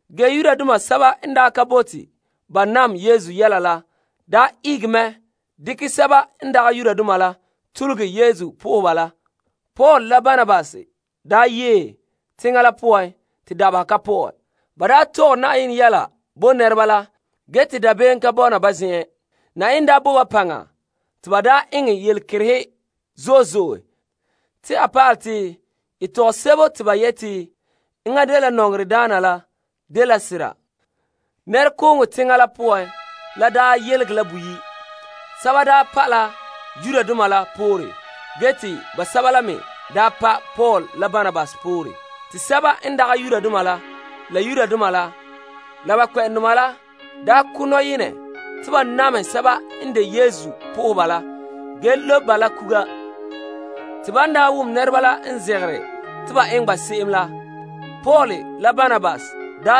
Ge Yudoma sɛba n ka bote ba nam Yesu yɛla la ihege mɛ dekɛ sɛba n dagɛ Yudoma la tugule Yesu po'oheba la. Paul la Barnabas yee teŋa la poan te dabeha ka pɔ'ɛ. Ba tɔgɛ Na'ayenɛ yɛla bo nɛreba la ge te dabeem ka ka bɔna ba zen'en. Na'ayenɛ bo ba paŋa te ba daa eŋɛ yelekerehe zo'e zo'e te a pa'alɛ te a zo'ohogɔ yeletɔgɔm la dela sera. Nɛrekooŋɔ teŋa la poan la yelege la boyi'. Sɛba pa' la Yudoma la poore ge te basɛba la daa pa' Paul la Barnabas la poore. Te sɛba n dagɛ Yudoma la basɛba la Yudoma la basɛba la ba kpɛ'ɛndoma la ko' nɔyenɛ te ba namehɛ sɛba n de Yesu po'oheba la ge lobe ba la kuga. Te ban wom nɛreba la n zegere te ba eŋɛ ba se'em la, Paul la Barnabas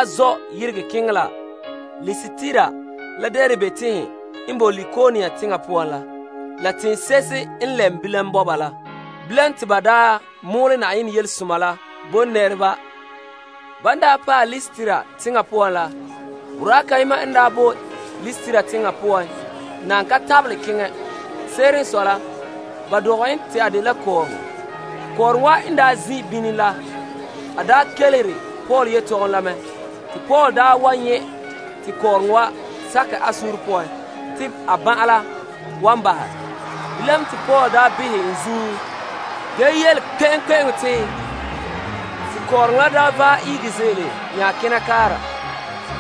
zɔ' yeregɛ keŋɛ la Listra la Derbe teŋhe n boe Likaonia teŋa poan la, la teŋse'ehe n lɛm bilam bɔba la. Bilam te ba mɔɔlɛ Yenɛ Yelesoma la bo nɛreba. Ban paɛ Listra teŋa la poan la, boraa kayema n boe Listra teŋa poan nan ka tabelɛ keŋɛ. Se'ere n sɔe la, ba dɔgɛ en te a dela kɔɔrɔŋɔ. Kɔɔrɔŋɔ wa n daa zin' bini la, a kelehere Paul yetɔgom la mɛ. Te Paul nyɛ' te kɔɔrɔŋɔ wa sakɛ a suunre poan te a ban'an la wan bahɛ. Bilam te Paul behɛ en ziin ge yele kpe'eŋkpe'eŋo te, Ihege saazuo ze'ele. Te kɔɔrɔŋɔ la vaɛ ihege ze'ele nya kena kaara.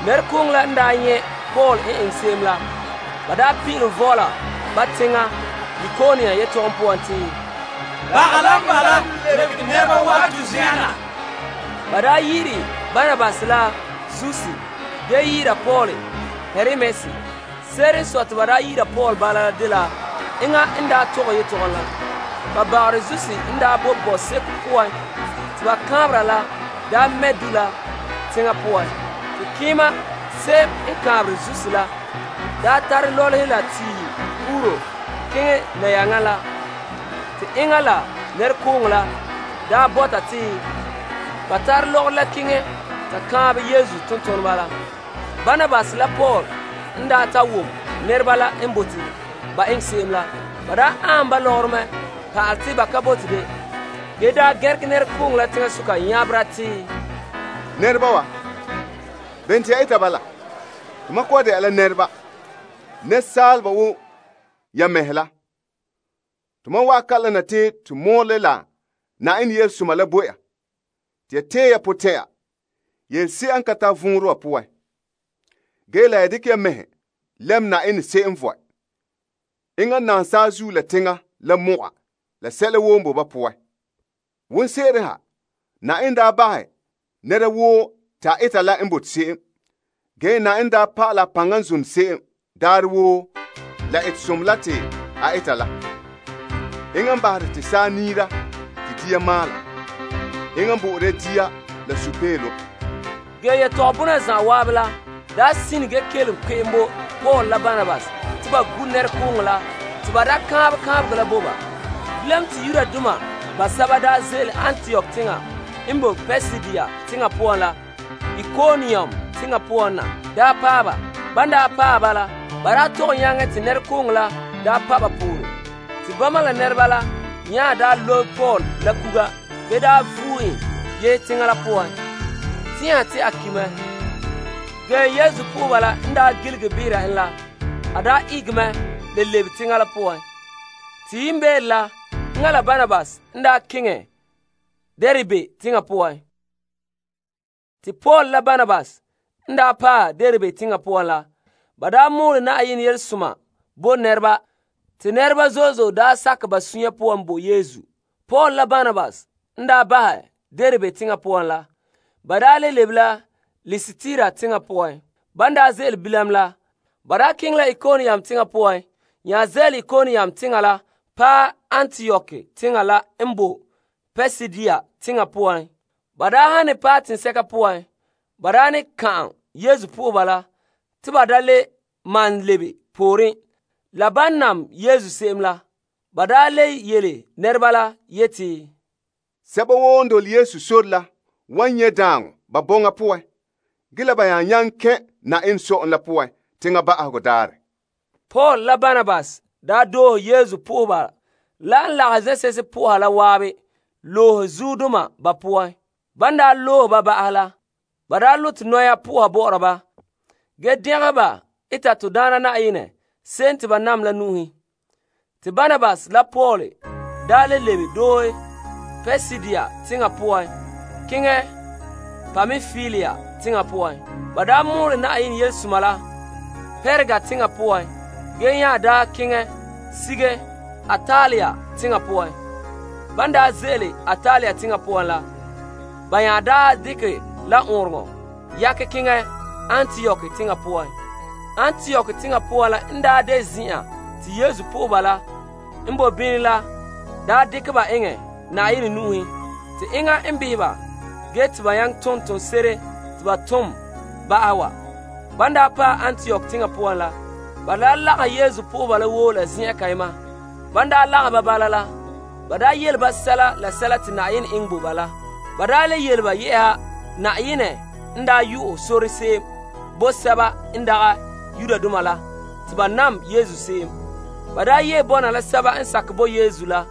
Nɛrekooŋɔ la n nyɛ' Paul n eŋɛ se'em la, ba pin'ilom vɔɔla ba teŋa Likaonia yetɔgom poan te, Baga la n bala lebege nɛreba wa'an to zen'en na. Ba yi'ire Barnabas la Zeus ge yi'ira Paul la Hermes. Se'ere n sɔe te ba yi'ira Paul bala la dela enŋa n daa tɔgɛ yetɔgom la. Ba bagarɛ Zeus n boe bɔseko poan te ba kaanbera la mɛ' du' la teŋa poan. Te keema se'em n kaanbere Zeus la tare lɔlehe la tiihe puru keŋɛ nayaŋa la. Te enŋa la nɛrekooŋɔ la bɔta te ba tare lɔgɔrɔ la keŋɛ ta kaanbɛ Yesu tontoneba la. Barnabas la Paul n ta wom nɛreba la n bote ba eŋɛ ba se'em la, ba aanhom ba lɔgɔrɔ mɛ pa'ala te ba ka bote de ge gɛnregɛ nɛrekooŋɔ la teŋasoka nyabera te, Nɛreba wa, bene te ya eta bala? Tomam kɔ'ɔn de'a la nɛreba, asaaleba wo ya mɛhe la. Tomam wa'an kalam na te to mɔɔlɛ la Yenɛ Yelesoma la bo ya te ya tee ya potɛn'ɛra ya yelese'a n ka tare vɔnrɛ wa bahɛ. Ge la ya dekɛ ya mɛhe lɛm Yenɛ, se'em vɔe. Enŋa naam saazuo la teŋa la mɔga la sɛla woo n boe ba poan. Wonseren ha, Yenɛ daa bahɛ nɛra woo te a eta la n bote se'em. Ge Yenɛ daa pa'alɛ a paŋa n zone se'em daarɛ woo la etesomɔ la te a eta la. Enŋa n bahere te saa niira te dia maala. Enŋa n bo'ore ya dia la sunpeelom. Ge yetɔgom bona zan'an la ka ta'an bahɛ te Paul la Barnabas te ba gu' nɛrekooŋɔ la te ba da kaanbɛ kaanbegɔ la bo ba. Bilam te Yudoma basɛba ze'ele Antiok teŋa n boe Pisidia teŋa poan la Ikonium teŋa poan na paɛ ba. Ban paɛ la, ba tɔgɛ nyaŋɛ te nɛrekooŋɔ la pa' ba poore. Te bama la nɛreba la nya lobe Paul la kuga ge da vue en yehe teŋa la poan tɛn'ɛha te a ki' mɛ. Ge Yesu nɛreba n gilige behera en la, a ihege mɛ le lebe teŋa la poan. Te yiimbeere la enŋa la Barnabas n keŋɛ Derbe teŋa poan. Te Paul la Barnabas n paɛ Derbe teŋa poan la, ba mɔɔlɛ yelesoma la bo nɛreba te nɛreba zo'e zo'e sakɛ ba sunya poan bo Yesu. Paul la Barnabas n bahɛ Derbe teŋa poan la, ba le lebe la Listra teŋa poan. Ban ze'ele bilam la, ba keŋɛ la Ikonium teŋa poan nya ze'ele Ikonium teŋa la paɛ Antiok teŋa la n boe Pisidia teŋa poan. Ba han ne paɛ teŋsɛka poan, ba ne ka'an Yesu nɛreba la te ba da le malom lebe pooren la ban nam Yesu se'em la. Ba le yele nɛreba la yeti, Sɛba woo n dole Yesu sore la wan nyɛ' daaŋɔ ba bɔŋa poan ge la ba nya nyaŋɛ kɛn' Yenɛ Sɔ'ɔlom la poan teŋa ba'ahegɔ daarɛ. Paul la Barnabas doohe Yesu po'oheba la n lagahɛ zen'se'ehe po'oha la zan'an loohe zuodoma ba poan. Ban zagahɛ ba mɛhe po'oha, ba loe keendoma la bɔ'ɔra ba to Daana Na'ayenɛ se'em te ba nam la nu'uhen. Te Barnabas la Paul le lebe doohe Pisidia teŋa poan keŋɛ Pampilia teŋa poan. Ba mɔɔlɛ Yenɛ Yelesoma la Perga teŋa poan ge nya daa keŋɛ sige Attalia teŋa poan. Ban ze'ele Ataliah teŋa poan la, ba nya dekɛ la ɔɔnrɔŋɔ kantɛ yakɛ keŋɛ Antiok teŋa poan. Antiok teŋa poan, zen'an te Yesu po'oheba la n boe bini la la dekɛ ba eŋɛ Yenɛ nu'uhen te enŋa n behe ba ge te ba nyaŋɛ ton toonse'ere te ba ton ba'ahɛ wa. Ban paɛ Antiok teŋa poan la, ba lagahɛ Yesu po'oheba la woo la zen'an kayema. Ban lagahɛ ba bala la, ba yele ba sɛla te Yenɛ eŋɛ bo ba la. Ba le yele ba yɛ'ɛha Yenɛ n yu'ɛ sore se'em bo sɛba n dagɛ Yudoma te ba nam Yesu se'em. Ba yee bɔna la sɛba n sakɛ bo Yesu la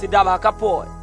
te dabeha ka pɔ'ɛ.